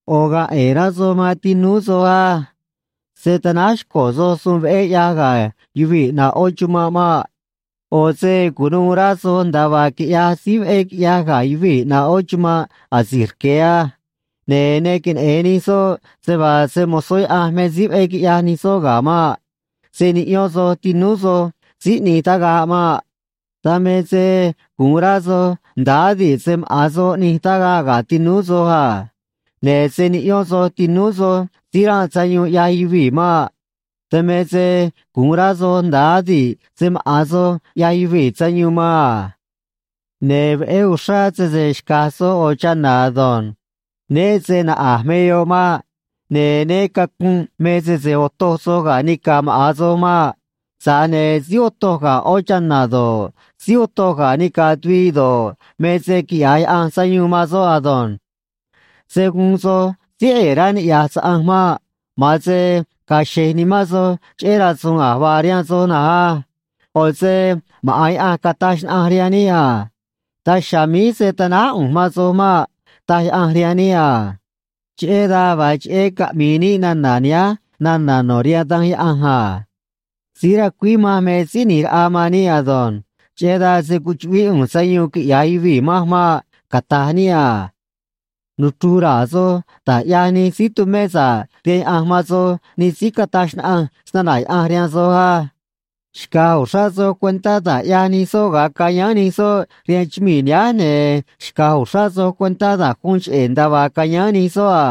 ꞌO̱ ga̱a̱ ꞌe̱e̱ rá soj man tinúú soj á. Se̱ tanáj xco̱ soj suun veꞌé ꞌyaj ga̱ yuvii̱ ꞌnaꞌ ꞌó chumanꞌ maꞌ. ꞌO̱ se cu̱nuû rá soj nda̱a vaa quiꞌyaj síí veꞌé quiꞌyaj ga̱ yuvii̱ ꞌnaꞌ ꞌó chumanꞌ asi̱j rque̱ á. Ne̱ ne queneꞌe̱n nij soꞌ se vaa se‑mo̱zó Yaꞌanj me síí veꞌé quiꞌyaj nij soꞌ ga̱ maꞌ. Se̱ niꞌyón soj tinúú soj síí ꞌni̱j tagaꞌ maꞌ. Dan me se gu̱un rá soj nda̱a adi̱ꞌ se maꞌa̱n soj ꞌnij tagaꞌ ga̱ tinúú soj a. Ne̱ se̱ niꞌyón soj tinúú soj síí ranꞌ sayuun ꞌyaj yuvii̱ maꞌ. Dan me se gu̱un rá soj nda̱a adi̱ꞌ se maꞌa̱n soj ꞌyaj yuvii̱ sayuun man a. Ne̱ veꞌé uxrá sese xca̱j soj ꞌo̱ chana̱ ado̱nj. Né se naꞌa̱j me yoꞌ maꞌ. Ne̱ né cacu̱nꞌ me sese otoj soj ga̱ nica̱ maꞌa̱n soj maꞌ. Tza̱j ne̱ síí otoj ga̱ ꞌó chana̱ do̱ꞌ, síí otoj ga̱ nica̱ tuviꞌ do̱ꞌ, me se quiꞌya̱j Yaꞌanj sayuun man soꞌ ado̱nj. Se̱ guun soj síí ꞌe̱e̱ rá niꞌya̱j saꞌanj maꞌ. Ma̱an se ga̱a̱ xe̱j nimán soj cheꞌé rasu̱u̱n a̱j vaa rihaan soj na̱nj á. ꞌO̱ se maꞌa̱n Yaꞌanj cataj xnaꞌanj rihaan níꞌ a: “Daj chiha̱a̱ míj se̱ tanáj ꞌu̱nj man soj maꞌ”, taj Yaꞌanj rihaan níꞌ a. Cheꞌé dan vaa cheꞌé caꞌmi̱i̱ níꞌ nana̱ nihánj nana̱ no̱ rihaan Danj Yaꞌanj a: Síí racuíj manj me Síí ꞌNi̱j Raꞌa man níꞌ ado̱nj. Cheꞌé dan se̱ cuchuꞌvíꞌ ꞌu̱nj sayuun quiꞌya̱j yuvii̱ manj maꞌ, cata̱j níꞌ a. Nuchru̱j ra̱a̱ soj da̱j ꞌyaj nij síí tumé sa̱ꞌ rihaan Yaꞌanj man soj, nij síí cataj xnaꞌanj snana̱ Yaꞌanj rihaan soj á. Xca̱j uxrá soj cuentá da̱j ꞌyaj nij soꞌ ga̱a cayáán nij soꞌ rihaan chumii̱ nihánj, ne̱ xca̱j uxrá soj cuentá da̱j guun cheꞌé nda̱a vaa cayáán nij soꞌ a.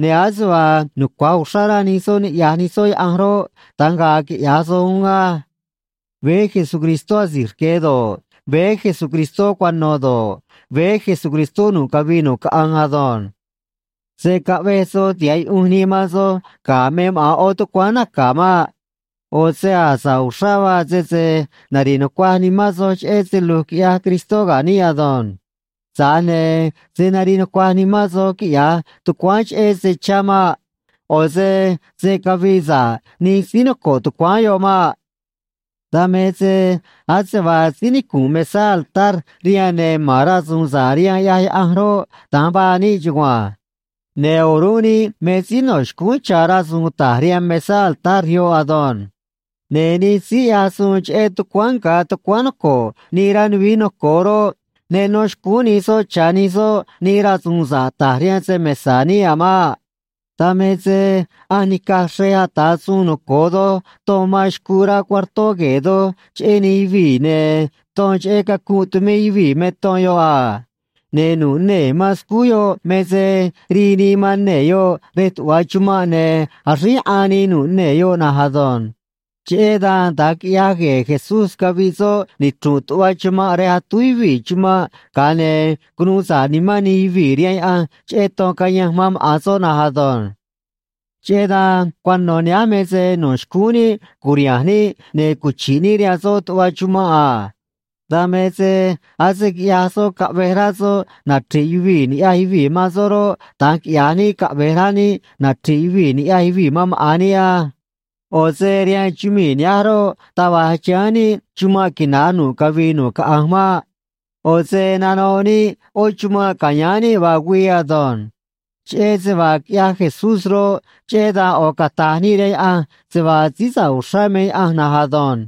Ne̱ ase vaa nucua̱j uxrá rá nij soꞌ niꞌya̱j nij soꞌ Yaꞌanj roꞌ, da̱nj ga̱a̱ quiꞌya̱j soj uún á. Veé Jesucristó asi̱j rque̱ do̱ꞌ, veé Jesucristó cuano̱ do̱ꞌ, veé Jesucristó nu̱ꞌ cavii nu̱ꞌ caꞌanj ado̱nj. Se̱ caꞌvej soj tiha̱ꞌ yuꞌunj nii man soj ga̱ me maꞌa̱n ꞌó tucuáán naca̱ maꞌ. ꞌO̱ se a̱j sa̱ꞌ uxrá vaa sese nari̱ꞌ nucuaj nimán soj cheꞌé se lu̱j quiꞌyaj Cristó ga̱ níꞌ ado̱nj. Tza̱j ne̱ se̱ nariꞌ nucuaj nimán soj quiꞌya̱j tucuáán cheꞌé se chá maꞌ. ꞌO̱ se se̱ cavii sa̱ꞌ nij síí noco̱ꞌ tucuáán yoꞌ maꞌ. Dan me se ase vaa síí nicu̱nꞌ mesá altar rihaan, ne̱ ma̱n rasu̱u̱n sa̱ꞌ rihaan ꞌyaj Yaꞌanj roꞌ, da̱nj vaa níꞌ chugua̱nj. Ne̱ o̱rúnꞌ níꞌ me síí no̱ xcúún cha̱ rasu̱u̱n ta̱j rihaan mesá altar yoꞌ ado̱nj. Ne̱ nij síí ꞌyaj suun cheꞌé tucuáán nga̱ tucuáán noco̱ꞌ nii rá nuvií noco̱o roꞌ, ne nó xcúún nij soꞌ cha̱ nij soꞌ nij rasu̱u̱n sa̱ꞌ ta̱j rihaan se‑mesa̱ níꞌ a̱ maꞌ. Dan me se ꞌanj nica̱j xrej ata̱ suun noco̱o doj ton man xcuu rá cuartó gue̱e̱ doj cheꞌé nij yuvii̱, ne̱ ton cheꞌé cacunꞌ tumé yuvii̱ me ton yoꞌ a. Ne̱ nu̱ꞌ nee̱ man scúj yoꞌ me se rii nii man nee̱ yoꞌ rej tuꞌva chumanꞌ, ne̱ axríj yaꞌan nii nu̱ꞌ nee̱ yoꞌ na̱nj ado̱nj. Cheꞌé dan da̱nj quiꞌyaj gue̱e̱ Jesús caviꞌ soꞌ nichru̱nꞌ tuꞌva chumanꞌ rej atúj yuvii̱ chumanꞌ, ga̱a ne̱ cunuu sa̱ꞌ nimán nij yuvii̱ rihaan Yaꞌanj cheꞌé ton cayanj man maꞌa̱n soꞌ na̱nj ado̱nj. Cheꞌé dan cuano̱ nihánj me se no̱ xcúún níꞌ cu̱riha̱nj níꞌ ne̱ cuchi̱ꞌ níꞌ rihaan soꞌ tuꞌva chumanꞌ a. Dan me se ase quiꞌyaj soꞌ caꞌvej rá soꞌ nachri̱ꞌ yuvii̱ ni̱ꞌyaj yuvii̱ man soꞌ roꞌ, da̱nj quiꞌya̱j níꞌ caꞌve̱j rá níꞌ nachri̱ꞌ yuvii̱ ni̱ꞌyaj yuvii̱ man maꞌa̱n níꞌ á. ꞌO̱ se rihaan chumii̱ nihánj roꞌ, taj va̱j chiháán níꞌ chumanꞌ quina̱j nu̱ꞌ cavii nu̱ꞌ caꞌanj maꞌ. ꞌO̱ se nanoꞌ níꞌ ꞌó chumanꞌ ca̱yáán níꞌ vaa güii ado̱nj. Cheꞌé se vaa quiꞌyaj Jesús roꞌ, cheꞌé dan ꞌo̱ cata̱j níꞌ rihaan Yaꞌanj se vaa síí sa̱ꞌ uxrá me Yaꞌanj na̱nj ado̱nj.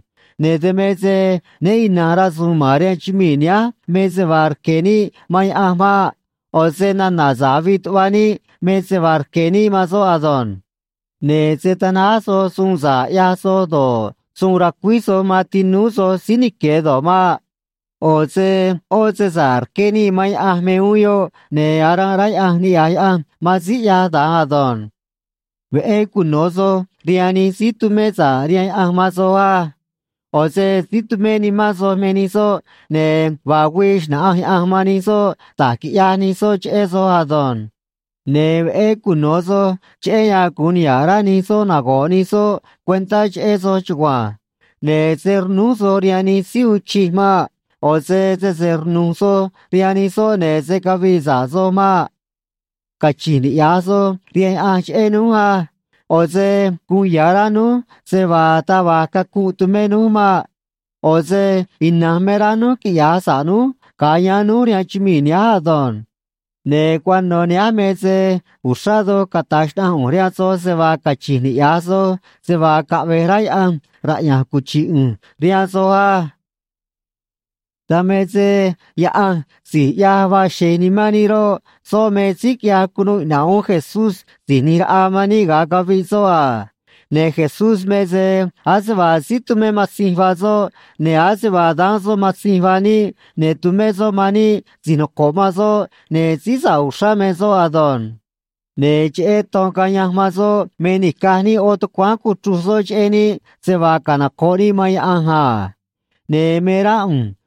Ne̱ dan me se né ina̱nj rasu̱u̱n ma̱n rihaan chumii̱ nihánj me se vaa rque̱ níꞌ man Yaꞌanj maꞌ. ꞌO̱ se nana̱ sa̱ꞌ avii tuꞌva níꞌ me se vaa rque̱ níꞌ man soꞌ ado̱nj. Ne̱ se̱ tanáj soj suun sa̱ꞌ ꞌyaj soj do̱ꞌ, suun racuíj soj man tinúú soj síí nique̱ do̱ꞌ maꞌ. ꞌO̱ se ꞌó se sa̱ꞌ rqué níꞌ man Yaꞌanj me uún yoꞌ, ne̱ aranꞌ rá Yaꞌanj niꞌya̱j Yaꞌanj man síí ꞌyaj da̱nj ado̱nj. Veꞌé cuno̱ soj rihaan nij síí tumé sa̱ꞌ rihaan Yaꞌanj man soj á. ꞌO̱ se síí tumé nimán soj me nij soꞌ, ne̱ vaa güii xna̱ꞌanj Yaꞌanj man nij soꞌ da̱j quiꞌyaj nij soꞌ cheꞌé soj ado̱nj. Ne̱ veꞌé cuno̱ soj, cheꞌé yan gu̱un niha̱ꞌ rá nij soꞌ nago̱ꞌ nij soꞌ cuentá cheꞌé soj chugua̱nj. Ne̱ se̱ rnúj soj rihaan nij síí uun chij maꞌ. ꞌO̱ se sese rnu̱j soj rihaan nij soꞌ, ne̱ se̱ cavii sa̱ꞌ soj maꞌ. Cachi̱nj niꞌya̱j soj rihaan Yaꞌanj cheꞌé núj á. ꞌO̱ se guun ya̱ rá núj se vaa taj va̱j cacunꞌ tumé núj maꞌ. ꞌO̱ se ina̱nj me rá núj quiꞌya̱j sa̱ꞌ núj ga̱a yáán núj rihaan chumii̱ nihánj ado̱nj. Ne̱ cuano̱ nihánj me se uxrá doj cata̱j xnaꞌanj ꞌu̱nj rihaan soj se vaa cachi̱nj niꞌya̱j soj se vaa caꞌve̱j rá Yaꞌanj raꞌya̱nj cuchi̱ꞌ uún ꞌu̱nj rihaan soj á. Dan me se Yaꞌanj si̱j ꞌyaj vaa xe̱j nimán níꞌ roꞌ, soꞌ me síí quiꞌyaj cunuu iꞌna̱ꞌ uún Jesús Si̱j ꞌNi̱j Raꞌa man níꞌ ga̱a caviꞌ soꞌ a. Ne̱ Jesús me se ase vaa síí tumé matzinj vaa soꞌ, ne̱ ase vaa daán soꞌ matzinj vaa níꞌ, ne̱ tumé soꞌ man níꞌ si̱j noco̱ꞌ man soꞌ, ne̱ síí sa̱ꞌ uxrá me soꞌ ado̱nj. Ne̱ cheꞌé ton cayanj man soꞌ me nica̱j níꞌ ꞌó tucuáán cuchruj soꞌ cheꞌé níꞌ se vaa canoco̱ꞌ níꞌ man Yaꞌanj a. Ne̱ me rá ꞌu̱nj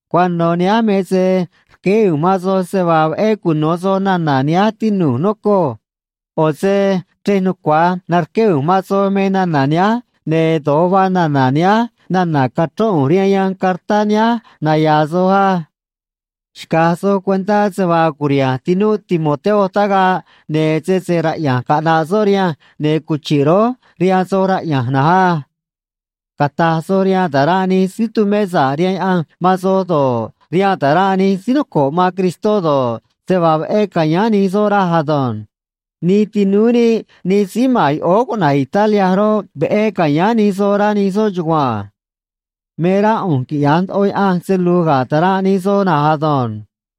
Cuano̱ nihánj me se rqueé ꞌu̱nj man soj se vaa veꞌé cuno̱ soj nana̱ nihánj, tinu̱j, nocoj. ꞌO̱ se chrej nucua̱j narqué ꞌu̱nj man soj me nana̱ nihánj, ne̱ do̱j vaa nana̱ nihánj nana̱ cachrón ꞌu̱nj rihaan yanj cartá nihánj naya̱a̱ soj á. Xca̱j soj cuentá se vaa curiha̱nj tinúꞌ Timoteo tagaꞌ, ne̱ sese raꞌya̱nj caꞌna̱ꞌ soꞌ rihanj, ne̱ cuchi̱ꞌ rój rihaan soj raꞌya̱nj na̱nj á. Cata̱j soj rihaan ta̱ranꞌ nij síí tumé sa̱ꞌ rihaan Yaꞌanj man soj do̱ꞌ, rihaan ta̱ranꞌ nij síí noco̱ꞌ man Cristó do̱ꞌ, se vaa veꞌé ca̱yáán nij soꞌ raj ado̱nj. Nij tinúú níꞌ nij síí ma̱n yoꞌóó cuꞌna̱j Italia roꞌ, veꞌé ca̱yáán nij soj, rá nij soꞌ chugua̱nj. Me rá ꞌu̱nj quiꞌya̱j ndoꞌo Yaꞌanj se lu̱j ga̱ ta̱ranꞌ nij soj na̱nj ado̱nj.